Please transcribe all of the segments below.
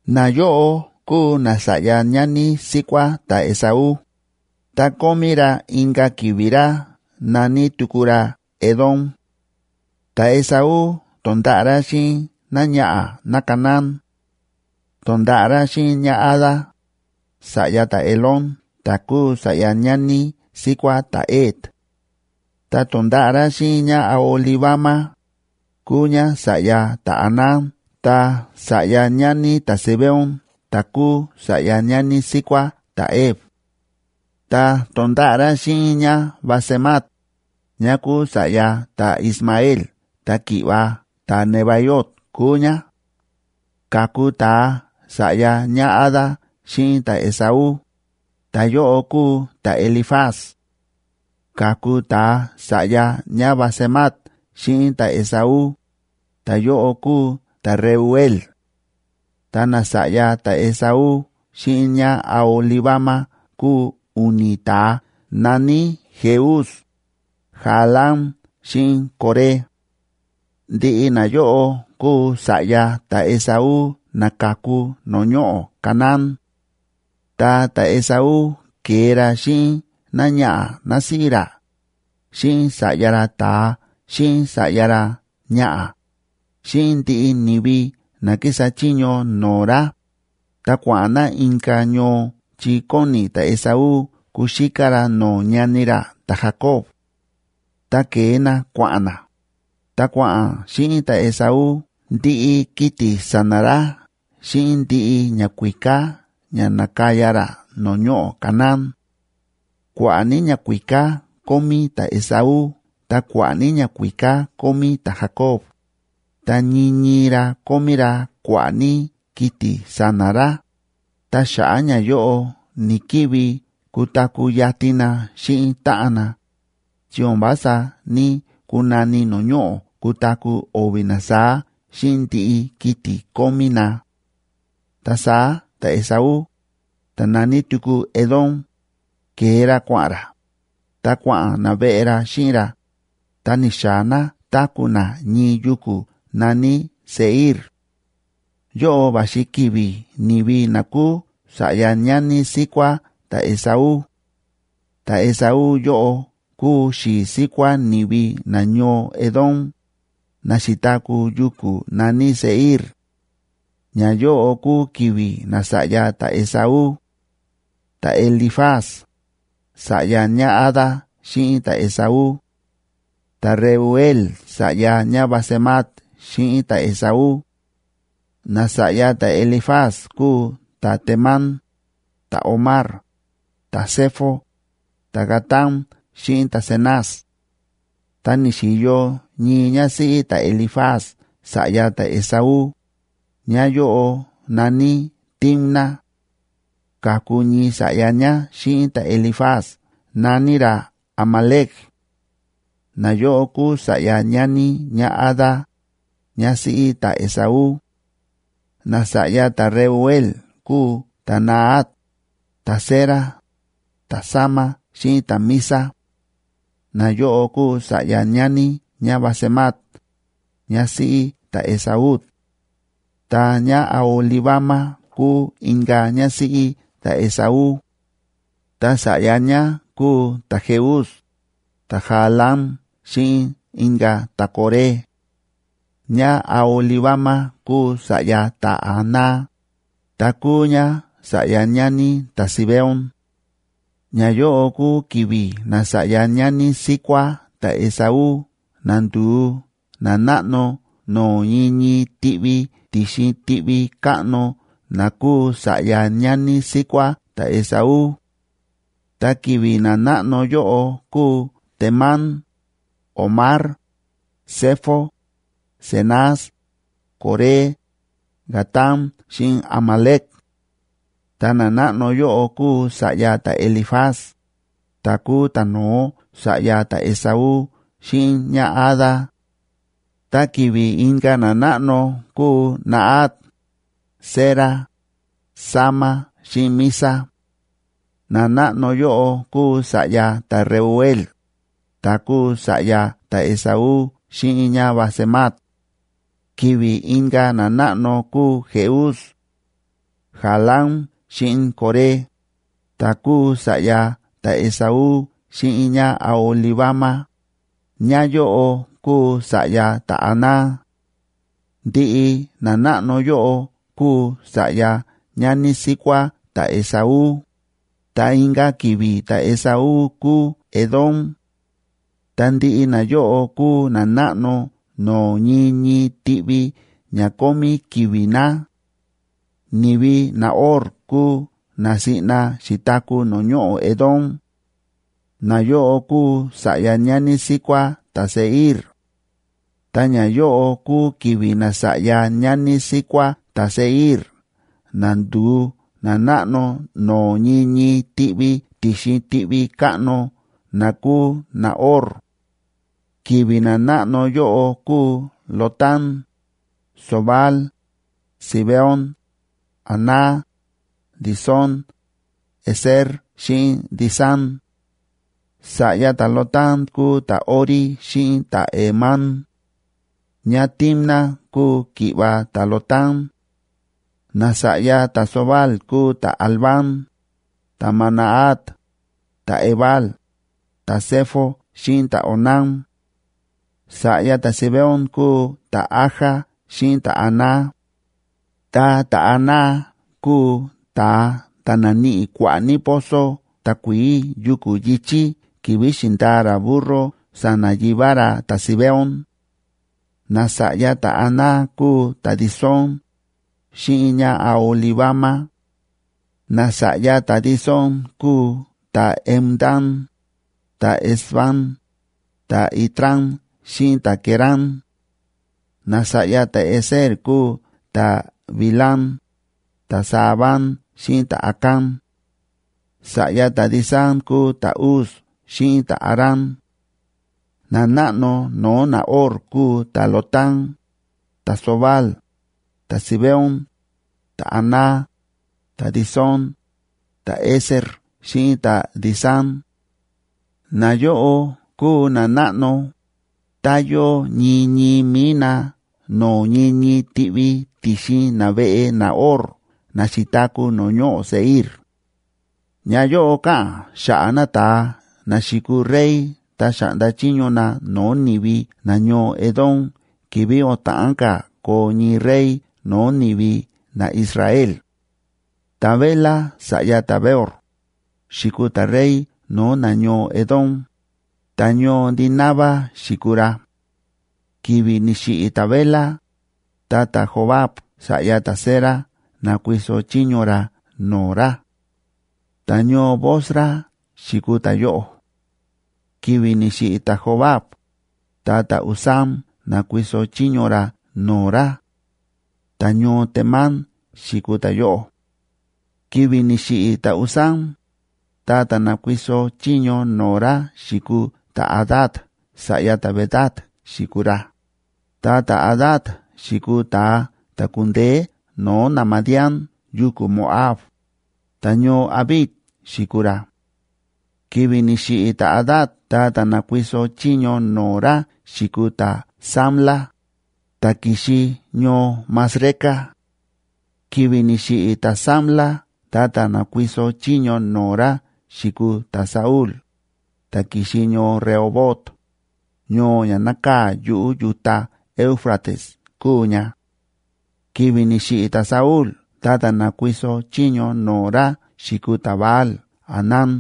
Nayóꞌo kúu nasa̱ꞌya ñani síkuá ta̱Esaú, ta kómí ra inka̱ ki̱vi̱ ra na̱ní tuku ra Edom. Ta̱Esaú to̱nda̱ꞌa̱ ra xíꞌin náñaꞌa̱ náCanaán; to̱nda̱ꞌa̱ ra xíꞌin ñáAda, sa̱ꞌya ta̱Elón ta̱ kúu sa̱ꞌya ñani síkuá ta̱Het; ta to̱nda̱ꞌa̱ ra xíꞌin ñáAholibama, kúu ñá sa̱ꞌya ta̱Aná ta sa̱ꞌya ñani ta̱Zibeón ta̱ kúu sa̱ꞌya ñani síkuá ta̱Hev; ta to̱nda̱ꞌa̱ ra xíꞌin ñáBasemat, ñá kúu sa̱ꞌya ta̱Ismael ta ki̱ꞌva̱ ta̱Nebaiot kúu ñá. Ka̱ku ta̱a sa̱ꞌya ñáAda xíꞌin ta̱Esaú, ta̱yóꞌo kúu ta̱Elifaz; ka̱ku ta̱a sa̱ꞌya ñáBasemat xíꞌin ta̱Esaú, ta̱yóꞌo kúu ta̱Reuel. Ta nasa̱ꞌya ta̱Esaú xíꞌin ñáAholibama kúu u̱ni̱ ta̱a na̱ní Jeús, Jaalam xíꞌin Coré. Ndiꞌi nayóꞌo kúu sa̱ꞌya ta̱Esaú na ka̱ku no̱o̱ ñoꞌo̱ Canaán. Ta ta̱Esaú ke̱e ra xíꞌin náñaꞌa̱ násíꞌí ra, xíꞌin sa̱ꞌya ra ta̱a xíꞌin sa̱ꞌya ra ñaꞌa̱, xíꞌin ndiꞌi ni̱vi na kísa chiño no̱o̱ ra, ta kua̱ꞌa̱n na inka̱ ñoo chi kóni ta̱Esaú kuxíká ra no̱o̱ ñani ra ta̱Jacob. Ta ke̱e na kua̱ꞌa̱n na, ta kua̱ꞌa̱n xíꞌin ta̱Esaú ndiꞌi kiti̱ sa̱na̱ ra xíꞌin ndiꞌi ñakuíká ña na̱kaya ra no̱o̱ ñoꞌo̱ Canaán. Kua̱ꞌa̱ ní ñakuíká kómí ta̱Esaú ta kua̱ꞌa̱ ní ñakuíká kómí ta̱Jacob, ta ñii ñii ra kómí ra kua̱ꞌa̱ ní kiti̱ sa̱na̱ ra, ta xa̱ꞌa̱ ñayóꞌo ni̱‑kivi kutaku̱ yatin na xíꞌin táꞌan na; chi o̱n vása ní‑kunani no̱o̱ ñoꞌo̱ kutaku̱ o̱vi̱ na saá xíꞌin ndiꞌi kiti̱ kómí na. Ta saá ta̱Esaú, ta̱ na̱ní tuku Edom, ke̱e ra kua̱ꞌa̱n ra, ta kua̱ꞌa̱n naveꞌe ra xíꞌin ra, ta ni̱xaa̱ na táku̱ na ñii yuku̱ na̱ní Seir. Yóꞌo va̱xi ki̱vi̱ ni̱vi na kúu sa̱ꞌya ñani síkuá ta̱Esaú; ta̱Esaú yóꞌo kúu xi̱i̱ síkuá ni̱vi nañoo Edom, na xi̱taku̱ yuku̱ na̱ní Seir. Ñayóꞌo kúu ki̱vi̱ nasa̱ꞌya ta̱Esaú: ta̱Elifaz, sa̱ꞌya ñáAda xíꞌin ta̱Esaú; ta̱Reuel sa̱ꞌya ñáBasemat xíꞌin ta̱Esaú. Nasa̱ꞌya ta̱Elifaz kúu ta̱Temán, ta̱Omar, ta̱Zefo, ta̱Gatam xíꞌin ta̱Cenaz. Ta ni̱xi̱yo ñii ñásíꞌí ta̱Elifaz sa̱ꞌya ta̱Esaú; ñáyóꞌo na̱ní Timna. Ka̱ku ñii sa̱ꞌya ñá xíꞌin ta̱Elifaz na̱ní ra Amalec. Nayóꞌo kúu sa̱ꞌya ñani ñáAda, ñásíꞌí ta̱Esaú. Nasa̱ꞌya ta̱Reuel kúu ta̱Nahat, ta̱Zera, ta̱Sama xíꞌin ta̱Miza. Nayóꞌo kúu sa̱ꞌya ñani ñáBasemat, ñásíꞌí ta̱Esaú. Ta ñáAholibama kúu inka̱ ñásíꞌí ta̱Esaú, ta sa̱ꞌya ñá kúu ta̱Jeús, ta̱Jaalam xíꞌin inka̱ ta̱Coré. ÑáAholibama kúu sa̱ꞌya ta̱Aná, ta kúu ñá sa̱ꞌya ñani ta̱Zibeón. Ñayóꞌo kúu ki̱vi̱ nasa̱ꞌya ñani síkuá ta̱Esaú na ndu̱u nanáꞌno no̱o̱ ñii ñii tiꞌvi ti̱xin tiꞌvi káꞌno na kúu sa̱ꞌya ñani síkuá ta̱Esaú. Ta ki̱vi̱ nanáꞌno yóꞌo kúu Temán, Omar, Zefo, Cenaz, Coré, Gatam xíꞌin Amalec. Ta nanáꞌno yóꞌo kúu sa̱ꞌya ta̱Elifaz, ta̱ kúu ta̱no̱ó sa̱ꞌya ta̱Esaú xíꞌin ñáAda. Ta ki̱vi̱ inka̱ nanáꞌno kúu Nahat, Zera, Sama xíꞌin Miza. Nanáꞌno yóꞌo kúu sa̱ꞌya ta̱Reuel, ta̱ kúu sa̱ꞌya ta̱Esaú xíꞌin ñáBasemat. Ki̱vi̱ inka̱ nanáꞌno kúu Jeús, Jaalam xíꞌin Coré, ta̱ kúu sa̱ꞌya ta̱Esaú xíꞌin ñáAholibama, ñáyóꞌo kúu sa̱ꞌya ta̱Aná. Ndiꞌi nanáꞌno yóꞌo kúu sa̱ꞌya ñani síkuá ta̱Esaú, ta inka̱ ki̱vi̱ ta̱Esaú kúu Edom. Ta ndiꞌi nayóꞌo kúu nanáꞌno no̱o̱ ñii ñii tiꞌvi ña kómí ki̱vi̱ na. Ni̱vi naHor kúu na siꞌna xi̱taku̱ no̱o̱ ñoꞌo̱ Edom; nayóꞌo kúu sa̱ꞌya ñani síkuá ta̱Seir. Ta ñayóꞌo kúu ki̱vi̱ nasa̱ꞌya ñani síkuá ta̱Seir na ndu̱u nanáꞌno no̱o̱ ñii ñii tiꞌvi ti̱xin tiꞌvi káꞌno na kúu naHor. Ki̱vi̱ nanáꞌno yóꞌo kúu Lotán, Sobal, Zibeón, Aná, Disón, Ezer xíꞌin Disán. Sa̱ꞌya ta̱Lotán kúu ta̱Hori xíꞌin ta̱Hemam. ÑáTimna kúu ki̱ꞌva̱ ta̱Lotán. Nasa̱ꞌya ta̱Sobal kúu ta̱Alván, ta̱Manahat, ta̱Ebal, ta̱Sefo xíꞌin ta̱Onam. Sa̱ꞌya ta̱Zibeón kúu ta̱Aja xíꞌin ta̱Aná. Ta ta̱Aná kúu ta̱a ta̱ na̱níꞌi kua̱ꞌa̱ ní pozo takuií yuku̱ yi̱chí ki̱vi̱ xi̱ndaa ra burro sa̱na̱ yivá ra ta̱Zibeón. Nasa̱ꞌya ta̱Aná kúu ta̱Disón, xíꞌin ñáAholibama. Nasa̱ꞌya ta̱Disón kúu ta̱Hemdán, ta̱Esbán, ta̱Itrán xíꞌin ta̱Querán. Nasa̱ꞌya ta̱Ezer kúu ta̱Bilhán, ta̱Zaaván xíꞌin ta̱Acán. Sa̱ꞌya ta̱Disán kúu ta̱Uz xíꞌin ta̱Arán. Nanáꞌno no̱o̱ naHor kúu ta̱Lotán, ta̱Sobal, ta̱Zibeón, ta̱Aná, ta̱Disón, ta̱Ezer xíꞌin ta̱Disán. Nayóꞌo kúu nanáꞌno, ta yóo ñii ñii mi̱i na no̱o̱ ñii ñii tiꞌvi ti̱xin naveꞌe naHor na xi̱taku̱ no̱o̱ ñoꞌo̱ Seir. Ñayóꞌo káꞌa̱n xa̱ꞌa̱ nata̱a na xi̱kuu rey ta xa̱ꞌnda chiño na no̱o̱ ni̱vi nañoo Edom ki̱vi̱ o̱n ta̱ꞌán ka̱ koo ñii rey no̱o̱ ni̱vi naIsrael. Ta̱Bela sa̱ꞌya ta̱Beor, xi̱kuu ta̱rey no̱o̱ nañoo Edom, ta̱ñoo Dinaba xi̱kuu ra. Ki̱vi̱ ni̱xiꞌi̱ ta̱Bela, ta ta̱Jobab sa̱ꞌya ta̱Zera na̱kuiso chiño ra no̱o̱ ra; ta̱ñoo Bosra xi̱kuu ta̱yóꞌo. Ki̱vi̱ ni̱xiꞌi̱ ta̱Jobab, ta ta̱Husam na̱kuiso chiño ra no̱o̱ ra; ta̱ñoo Temán xi̱kuu ta̱yóꞌo. Ki̱vi̱ ni̱xiꞌi̱ ta̱Husam, ta ta̱ na̱kuiso chiño no̱o̱ ra xi̱kuu ta̱Hadad sa̱ꞌya ta̱Bedad xi̱kuu ra, ta ta̱Hadad xi̱kuu ta̱a ta̱ ku̱ndeé no̱o̱ naMadián yuku̱ Moab, ta̱ñoo Avit xi̱kuu ra. Ki̱vi̱ ni̱xiꞌi̱ ta̱Hadad ta ta̱ na̱kuiso chiño no̱o̱ ra xi̱kuu ta̱Samla, ta̱ ki̱xi ñoo Masreca. Ki̱vi̱ ni̱xiꞌi̱ ta̱Samla ta ta̱ na̱kuiso chiño no̱o̱ ra xi̱kuu ta̱Saúl, ta̱ ki̱xi ñoo Rehobot, ñoo ña nákaa̱ yuꞌu̱ yu̱ta Éufrates kúu ña. Ki̱vi̱ ni̱xiꞌi̱ ta̱Saúl ta ta̱ na̱kuiso chiño no̱o̱ ra xi̱kuu ta̱Baal‑hanán,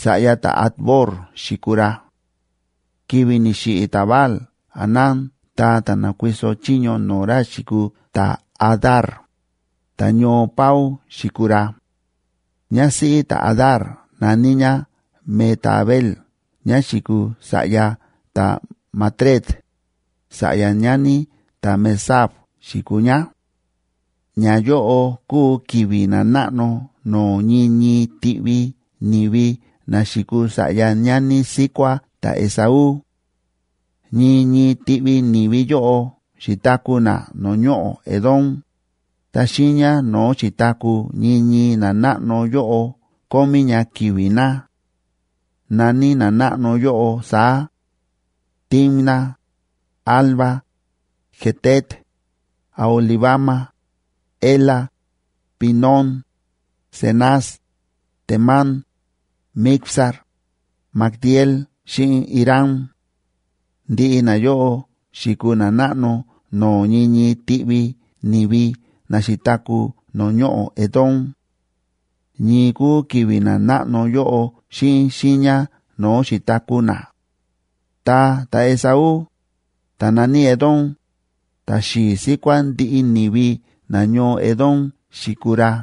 sa̱ꞌya ta̱Acbor xi̱kuu ra. Ki̱vi̱ ni̱xiꞌi̱ ta̱Baal‑hanán ta ta̱ na̱kuiso chiño no̱o̱ ra xi̱kuu ta̱Hadar, ta ta̱ñoo Pau xi̱kuu ra. Ñásíꞌí ta̱Hadar na̱ní ñá Mehetabel ñá xi̱kuu sa̱ꞌya ta̱Matred, sa̱ꞌya ñani ta̱Mezaab xi̱kuu ñá. Ñayóꞌo kúu ki̱vi̱ nanáꞌno no̱o̱ ñii ñii tiꞌvi ni̱vi na xi̱kuu sa̱ꞌya ñani síkuá ta̱Esaú. Ñii ñii tiꞌvi ni̱vi yóꞌo xi̱taku̱ na no̱o̱ ñoꞌo̱ Edom, ta xiiña no̱o̱ xi̱taku̱ ñii ñii nanáꞌno yóꞌo kómí ña ki̱vi̱ na. Na̱ní nanáꞌno yóꞌo saá: Timna, Alva, Jetet, Aholibama, Ela, Pinón, Cenaz, Temán, Mibzar, Magdiel xíꞌin Iram. Ndiꞌi nayóꞌo xi̱kuu nanáꞌno no̱o̱ ñii ñii tiꞌvi ni̱vi na xi̱taku̱ no̱o̱ ñoꞌo̱ Edom. Ñii kúu ki̱vi̱ nanáꞌno yóꞌo xíꞌin xiiña no̱o̱ xi̱taku̱ na. Ta ta̱Esaú, ta̱ na̱ní Edom, ta̱xi̱i̱ síkuá ndiꞌi ni̱vi nañoo Edom xi̱kuu ra.